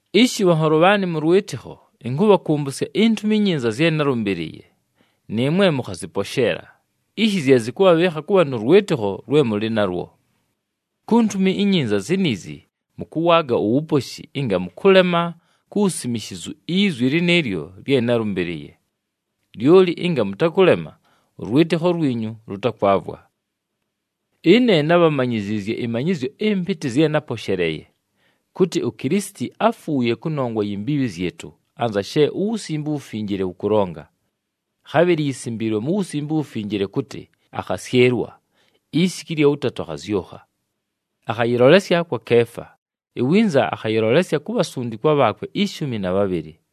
Ishi bhanholo bhaanɨ mʉ lwɨtɨkho, ɨnkʉbhakʉmbʉsya iNtumi iNyinza zye nábhalʉmbɨlɨɨye, nɨɨmwe mʉkhazɨposheela, ishi zye zɨkʉbhabhɨɨkha kʉbha nʉ lwɨtɨkho lwe mʉlɨ nalwo. Ku Ntumi iNyinza ziniizi mʉkʉwaaga uwuposhi ɨnga mʉkʉlema ku wusimishizu izwi lɨnɨɨlyo lye nálʉmbɨlɨɨye. Lyoli ɨnga mʉtakʉlema, ʉlwɨtɨkho lwinyu lʉtakwavwa. Ɨne nábhamanyiziizye ɨmanyɨzyo ɨmpɨtɨ zye náposheleeye, kʉtɨ uKilisiti áfuuye kʉnongwa yi mbiibhi zyɨtʉ, anza she uWusimbe uWufinjile wʉkʉlonga. Khabhɨlɨ yisimbiilwe mu Wusimbe uWufinjile kʉtɨ akhasyɨlwa, isiku ɨlya wʉtatʉ akhazyʉkha. Akhayɨlolesya kwa Keefa, iwinza akhayɨlolesya ku bhasundikwa bhaakwe ishumi na bhabhɨlɨ.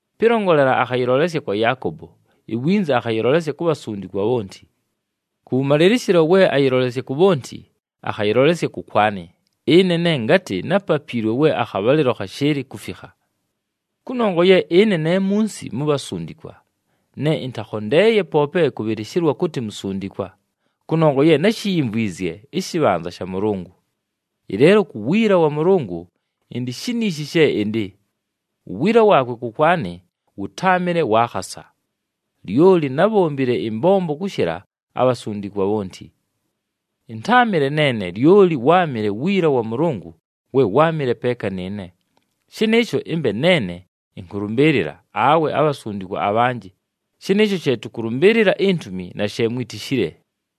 Pɨlongolela, akhayɨlolesya kwa Yaakobo, iwinza akhayɨlolesya ku bhasundikwa bhonti. Kʉwʉmalɨlɨshɨlo we ayɨlolesya ku bhonti, akhayɨlolesya kʉkwanɨ, ɨne ne ngatɨ nápapiilwe we akhabhalɨlo khashɨɨlɨ kufikha. Kʉnongwa ye ɨne ne munsi mu bhasundikwa, ne ɨntakhondeeye poope kʉbhɨlɨshɨlwa kʉtɨ musundikwa, kʉnongwa ye náshiyimvwizye ɨshɨbhanza sha Mʉlʉngʉ. Ɨleelo ku wiila wa Mʉlʉngʉ, ɨndɨ shiniishi she ɨndɨ. Uwiila waakwe kʉkwanɨ wʉtáamɨle wa khasa. Lyoli nábhombile ɨmbombo kʉshɨla abhasundikwa bhonti. Ɨntáamɨle neene, lyoli wáamɨle wiila wa Mʉlʉngʉ we wáamɨle peeka nɨɨne. Shɨnɨɨsho ɨmbe neene ɨnkʉlʉmbɨɨlɨla, awe abhasundikwa abhanjɨ, shɨnɨɨsho she tʉkʉlʉmbɨɨlɨla intumi, na she mwitishile.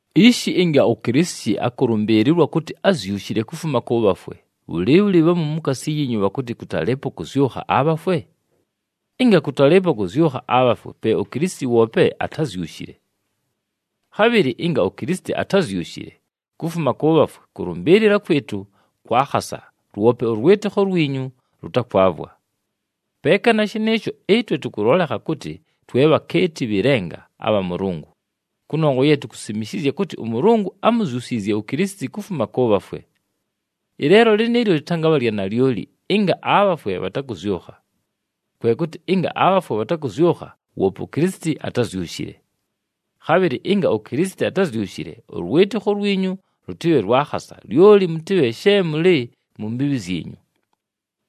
Ishi ɨnga uKilisiti akʉlʉmbɨɨlɨlwa kʉtɨ ázyushile kufuma kʉ bhafwe, bhʉlɨɨbhʉlɨ bhamu mukaasi yiinyu bhakʉtɨ kʉtalɨɨpo kʉzyʉkha abhafwe? Ɨnga kʉtalɨɨpo kʉzyʉkha abhafwe, pe uKilisiti woope atázyushile. Khabhɨlɨ ɨnga uKilisiti atázyushile kufuma kʉ bhafwe, kʉlʉmbɨɨlɨla kwɨtʉ kwa khasa, lwope ʉlwɨtɨkho lwinyu lʉtakwavwa. Peeka na shɨnɨɨsho, ɨtwe tʉkʉlolekha kʉtɨ twe bhakeeti bhɨ lenga abha Mʉlʉngʉ, kʉnongwa ye tukusimishizya kʉtɨ ʉMʉlʉngʉ ámuzyusiizye uKilisiti kufuma kʉ bhafwe. Ɨleelo lɨnɨɨlyo lɨtangabha lya nalyoli ɨnga abhafwe bhatakʉzyʉkha. Kwe kʉtɨ ɨnga abhafwe bhatakʉzyʉkha, woope uKilisiti atázyushile. Khabhɨlɨ ɨnga uKilisiti atázyushile, ʉlwɨtɨkho lwinyu lʉtɨbhe lwa khasa, lyoli mʉtɨbhe she mʉlɨ mu mbiibhi zyinyu.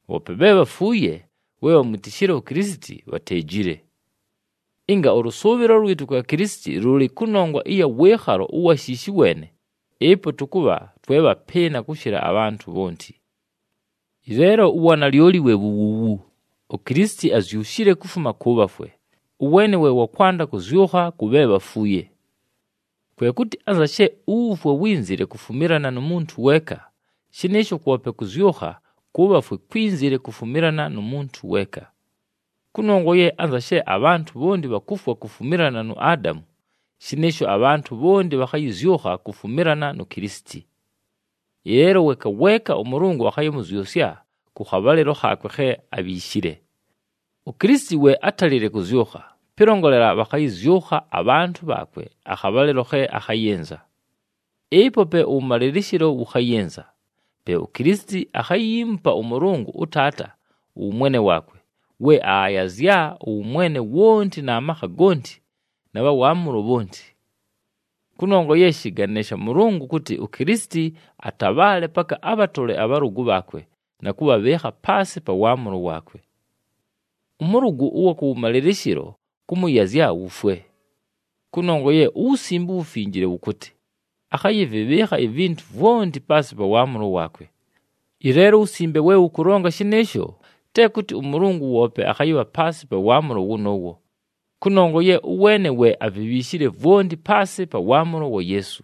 Bhoope bhe bhafuuye we bhamwitishile uKilisiti, bhateejile. Ɨnga ʉlʉsʉʉbhɨlo lwɨtʉ kwa Kilisiti lʉlɨ kʉnongwa ɨya wɨɨkhalo ʉwa shiishi weene, ɨpo tʉkʉbha twe bhapɨɨna kʉshɨla abhantʉ bhonti. Ɨleelo uwanalyoli we wu wuuwu: uKilisiti azyushile kufuma kʉ bhafwe, ʉweene we wa kwanda kʉzyʉkha kʉ bhe bhafuuye. Kwe kʉtɨ anza she uwufwe wínzile kufumilana nu muntu weeka, shɨnɨɨsho kwope kʉzyʉkha kʉ bhafwe kwínzile kufumilana nu muntu weeka. Kʉnongwa ye anza she abhantʉ bhonti bhakufwa kufumilana nu Adamu, shɨnɨɨsho abhantʉ bhonti bhakhayɨzyʉkha kufumilana nu Kilisiti. Ɨleelo weeka weeka ʉMʉlʉngʉ akhayɨmʉzyʉsya kʉ khabhalɨlo khaakwe khe abhiishile. UKilisiti we átalile kʉzyʉkha, pɨlongolela bhakhayɨzyʉkha abhantʉ bhaakwe akhabhalɨlo khe akhayɨnza. Ɨpo pe ʉwʉmalɨlɨshɨlo wʉkhayɨnza, pe uKilisiti akhayiimupa ʉMʉlʉngʉ ʉTaata ʉwʉmwene waakwe, we aayazya ʉwʉmwene wonti na makha gonti na bha waamʉlo bhonti. Kʉnongwa ye shɨgane sha Mʉlʉngʉ kʉtɨ uKilisiti atabhaale paka abhatole abhalʉgʉ bhaakwe na kʉbhabhɨɨkha paasɨ pa waamʉlo waakwe. Ʉmʉlʉgʉ ʉwa kʉwʉmalɨlɨshɨlo kʉmʉyazya wufwe. Kʉnongwa ye uWusimbe uWufinjile wʉkʉtɨ, “Akhayɨvɨbhɨɨkha ivintu vwonti paasɨ pa waamʉlo waakwe.” Ɨleelo uWusimbe we wʉkʉlonga shɨnɨɨsho, te kʉtɨ ʉMʉlʉngʉ woope akhayɨbha paasɨ pa waamʉlo wʉnʉʉwo, kʉnongwa ye ʉweene we avibhiishile vwonti paasɨ pa waamʉlo wa Yeesu.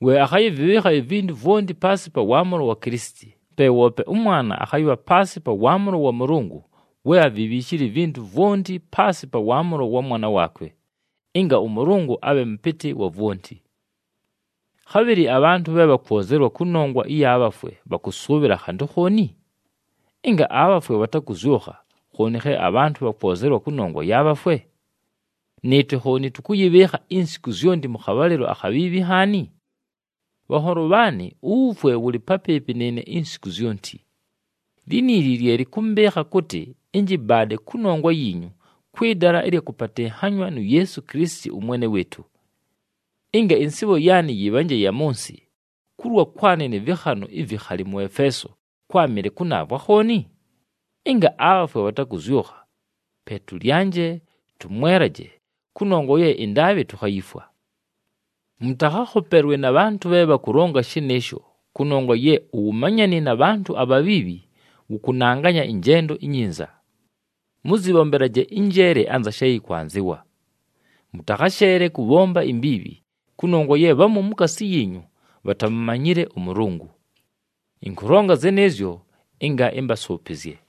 We akhayɨvɨbhɨɨkha ivintu vwonti paasɨ pa waamʉlo wa Kilisiti, pe woope ʉmwana akhayɨbha paasɨ pa waamʉlo wa Mʉlʉngʉ we avibhiishile ivintu vwonti paasɨ pa waamʉlo wa Mwana waakwe, ɨnga ʉMʉlʉngʉ abhe Mʉpɨtɨ wa vwonti. Khabhɨlɨ abhantʉ bhe bhakwozelwa kʉnongwa ɨya bhafwe bhakʉsʉʉbhɨla khantʉ khooni? Ɨnga abhafwe bhatakʉzyʉkha, khooni khe abhantʉ bhakwozelwa kʉnongwa ya bhafwe? Nɨɨtwe khooni tʉkʉyɨbhɨɨkha insiku zyonti mʉ khabhalɨlo akhabhiibhi nhaani? Bhanholo bhaanɨ, uwufwe wʉlɨ papɨɨpɨ nɨɨne insiku zyonti. Liniili lye lɨkʉmbɨɨkha kʉtɨ ɨnjɨbaade kʉnongwa yiinyu kwɨ dala ɨlya kʉpatɨnhanywa nu Yeesu Kilisiti ʉMwene wɨɨtʉ. Ɨnga ɨnsɨɨbho yaanɨ yɨbhanje ya mʉ nsɨ, kulwa kwanɨ nɨ vɨkhanʉ ivikhali mʉ Efeeso kwámɨle kʉnaavwe akhooni? Ɨnga abhafwe bhatakʉzyʉkha, “Pe tʉlyanje, tʉmwelaje, kʉnongwa ye ɨndaabhɨ tukhayifwa.” Mʉtakhakhopelwe na bhantʉ bhe bhakʉlonga shɨnɨɨsho, kʉnongwa ye “Uwumanyani na bhantʉ abhabhiibhi, wʉkʉnanganya ɨnjendo inyinza.” Mʉzɨbhombelaje ɨnjeele anza she yɨkwanzɨwa, mʉtakhasheele kʉbhomba imbiibhi, kʉnongwa ye bhamu mukaasi yiinyu bhatamumanyile ʉMʉlʉngʉ. Ɨnkʉlonga zɨnɨɨzyo ɨnga ɨmbasʉʉpɨzye.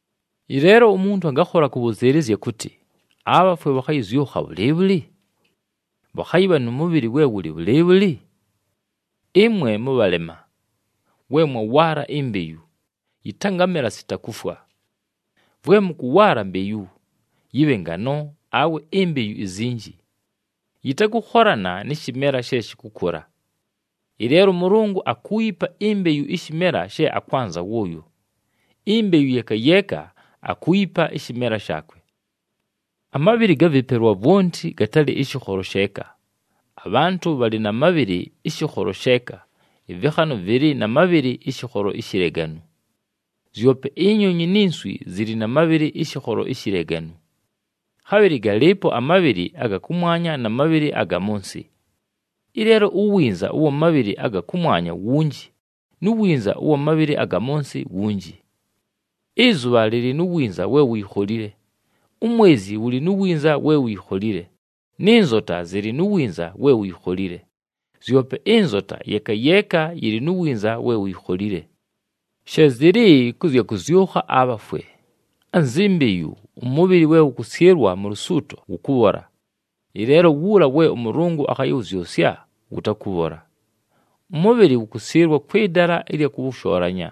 Ɨleelo umuntu angakhola kʉbhʉzɨɨlɨzya kʉtɨ, “Abhafwe bhakʉzyʉkha bhʉlɨɨbhʉlɨ? Bhakhayɨbha nʉ mʉbhɨlɨ we wʉlɨ bhʉlɨɨbhʉlɨ?” Ɨmwe mʉbhalema! We mwawaala imbeyu, yɨtangamela sita kufwa. Vwe mʉkʉwaala mbeyu, yɨbhe ngano awe imbeyu izinji, yɨtakʉkholana nɨ shɨmela she shɨkʉkʉla. Ɨleelo ʉMʉlʉngʉ akuuyipa imbeyu ɨshɨmela she akwanza wʉʉyo, imbeyu yeeka yeeka akuuyipa ɨshɨmela shaakwe. Amabhɨlɨ ga vɨpelwa vwonti gatalɨ ɨshɨkholo sheeka. Abhantʉ bhalɨ na mabhɨlɨ ɨshɨkholo sheeka, ɨvɨkhanʉ vɨlɨ na mabhɨlɨ ɨshɨkholo ishileganu. Zyope inyonyi ni nswi zɨlɨ na mabhɨlɨ ɨshɨkholo ishileganu. Khabhɨlɨ galɨɨpo amabhɨlɨ aga kʉmwanya na mabhɨlɨ aga mʉ nsɨ. Ɨleelo uwinza ʉwa mabhɨlɨ aga kʉmwanya wunji, nu winza ʉwa mabhɨlɨ aga mʉ nsɨ wunji. Ɨzʉbha lɨlɨ nu winza we wuyikholile, umwezi wʉlɨ nu winza we wuyikholile nɨ nzota zɨlɨ nu winza we wuyikholile. Zyope ɨnzota, yeeka yeeka yɨlɨ nu winza we wuyikholile. She zɨlɨ kʉ zya kʉzyʉkha abhafwe. Anzi mbeyu, ʉmʉbhɨlɨ we wʉkʉsyɨlwa mu lusuuto wʉkʉbhola, ɨleelo wuula we ʉMʉlʉngʉ akhayɨwʉzyʉsya wʉtakʉbhola. Ʉmʉbhɨlɨ wʉkʉsyɨlwa kwɨ dala ɨlya kʉwʉshoolanya,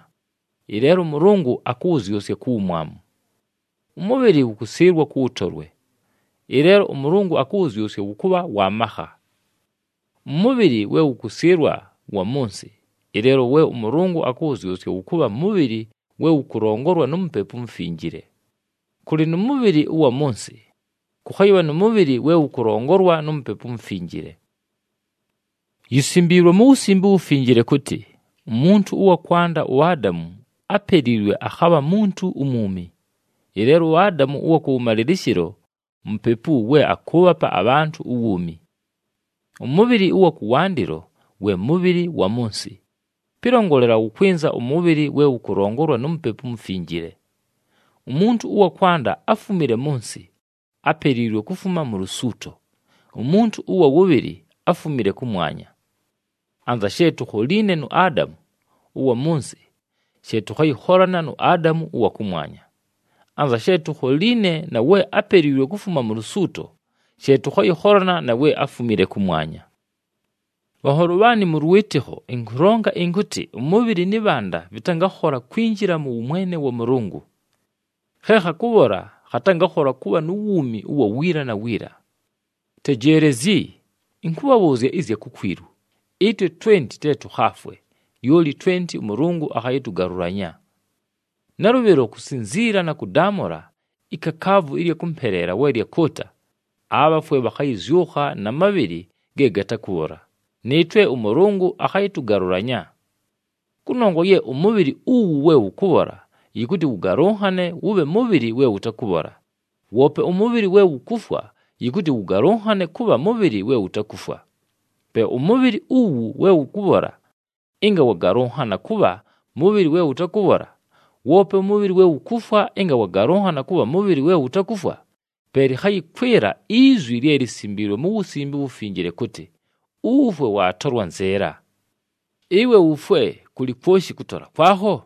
ɨleelo ʉMʉlʉngʉ akʉwʉzyʉsya ku wumwamu. Ʉmʉbhɨlɨ wʉkʉsyɨlwa kʉ wʉtolwe, ɨleelo ʉMʉlʉngʉ akʉwʉzyʉsya wʉkʉbha wa makha. Ʉmʉbhɨlɨ we wʉkʉsyɨlwa wa mʉ nsɨ, ɨleelo we ʉMʉlʉngʉ akʉwʉzyʉsya wʉkʉbha mʉbhɨlɨ we wʉkʉlongolwa nu Mupepu uMufinjile. Kʉlɨ nʉ mʉbhɨlɨ ʉwa mʉ nsɨ, kʉkhayɨbha nʉ mʉbhɨlɨ we wʉkʉlongolwa nu Mupepu uMufinjile. Yisimbiilwe mu Wusimbe uWufinjile kʉtɨ, “Umuntu ʉwa kwanda uAdamu, ápeliilwe, akhabha muntu umwumi.” Ɨleelo uAdamu ʉwa kʉwʉmalɨlɨshɨlo Mupepu we akʉʉbhapa abhantʉ uwuumi. Ʉmʉbhɨlɨ ʉwa kʉwandɨlo we mʉbhɨlɨ wa mʉ nsɨ, pɨlongolela wʉkwɨnza ʉmʉbhɨlɨ we wʉkʉlongolwa nu Mupepu uMufinjile. Umuntu ʉwa kwanda áfumile mʉ nsɨ, ápeliilwe kufuma mu lusuuto, umuntu ʉwa wʉbhɨlɨ áfumile kʉmwanya. Anza she tukholiine nu Adamu ʉwa mʉ nsɨ, she tʉkhayɨkholana nu Adamu ʉwa kʉmwanya. Anza she tukholiine na we ápeliilwe kufuma mu lusuuto, she tʉkhayɨkholana na we áfumile kʉmwanya. Bhanholo bhaanɨ mʉ lwɨtɨkho, ɨnkʉlonga ɨnkʉtɨ, ʉmʉbhɨlɨ nɨ bhanda vɨtangakhola kwinjila mʉ wʉmwene wa Mʉlʉngʉ. Khe khakʉbhola khatangakhola kʉbha nu wuumi ʉwa wiila na wiila. Tejeelezyi, ɨnkʉbhabhʉʉzya ɨzya kukwilu: ɨtwe twenti te tʉkhaafwe, lyoli twenti ʉMʉlʉngʉ akhayɨtʉgalʉlanya. Nalʉbhɨlo kusinziila na kʉdaamʉla, ikakaavu ɨlya kʉmpeleela we lyakʉʉta, abhafwe bhakhayɨzyʉkha na mabhɨlɨ ge gatakʉbhola, nɨɨtwe ʉMʉlʉngʉ akhayɨtʉgalʉlanya. Kʉnongwa ye ʉmʉbhɨlɨ uwu we wʉkʉbhola yɨkʉtɨ wʉgalʉnhane wʉbhe mʉbhɨlɨ we wʉtakʉbhola, woope ʉmʉbhɨlɨ we wukufwa yɨkʉtɨ wʉgalʉnhane kʉbha mʉbhɨlɨ we wutakufwa. Pe ʉmʉbhɨlɨ uwu we wʉkʉbhola ɨnga wagalʉnhana kʉbha mʉbhɨlɨ we wʉtakʉbhola, woope ʉmʉbhɨlɨ we wukufwa ɨnga wagalʉnhana kʉbha mʉbhɨlɨ we wutakufwa, pe lɨkhayɨkwɨla izwi lye lisimbiilwe mu Wusimbe uWufinjile kʉtɨ, “Uwufwe waatolwa nzɨɨla!” “Ɨwe wufwe, kʉlɨ kwoshi kʉtola kwakho?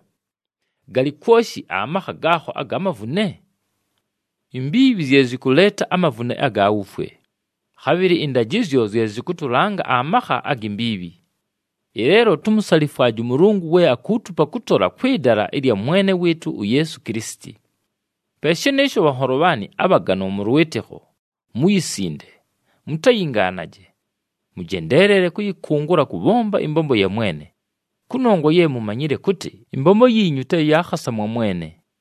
Galɨ kwoshi amakha gaakho aga mavune?” Imbiibhi zye zɨkʉleeta amavune aga wufwe, khabhɨlɨ ɨndajɨzyo zye zɨkʉtʉlanga amakha agi mbiibhi. Ɨleelo tumusalifwaje ʉMʉlʉngʉ we akuutupa kʉtola kwɨ dala ɨlya Mwene wɨɨtʉ uYeesu Kilisiti. Pe shɨnɨɨsho bhanholo bhaanɨ abhaganwa mʉ lwɨtɨkho, muyisinde, mutayingaanaje. Mʉjendeelele kʉyɨkʉngʉla kʉbhomba ɨmbombo ya Mwene, kʉnongwa ye mumanyile kʉtɨ, ɨmbombo yiinyu te ya khasa mwa Mwene.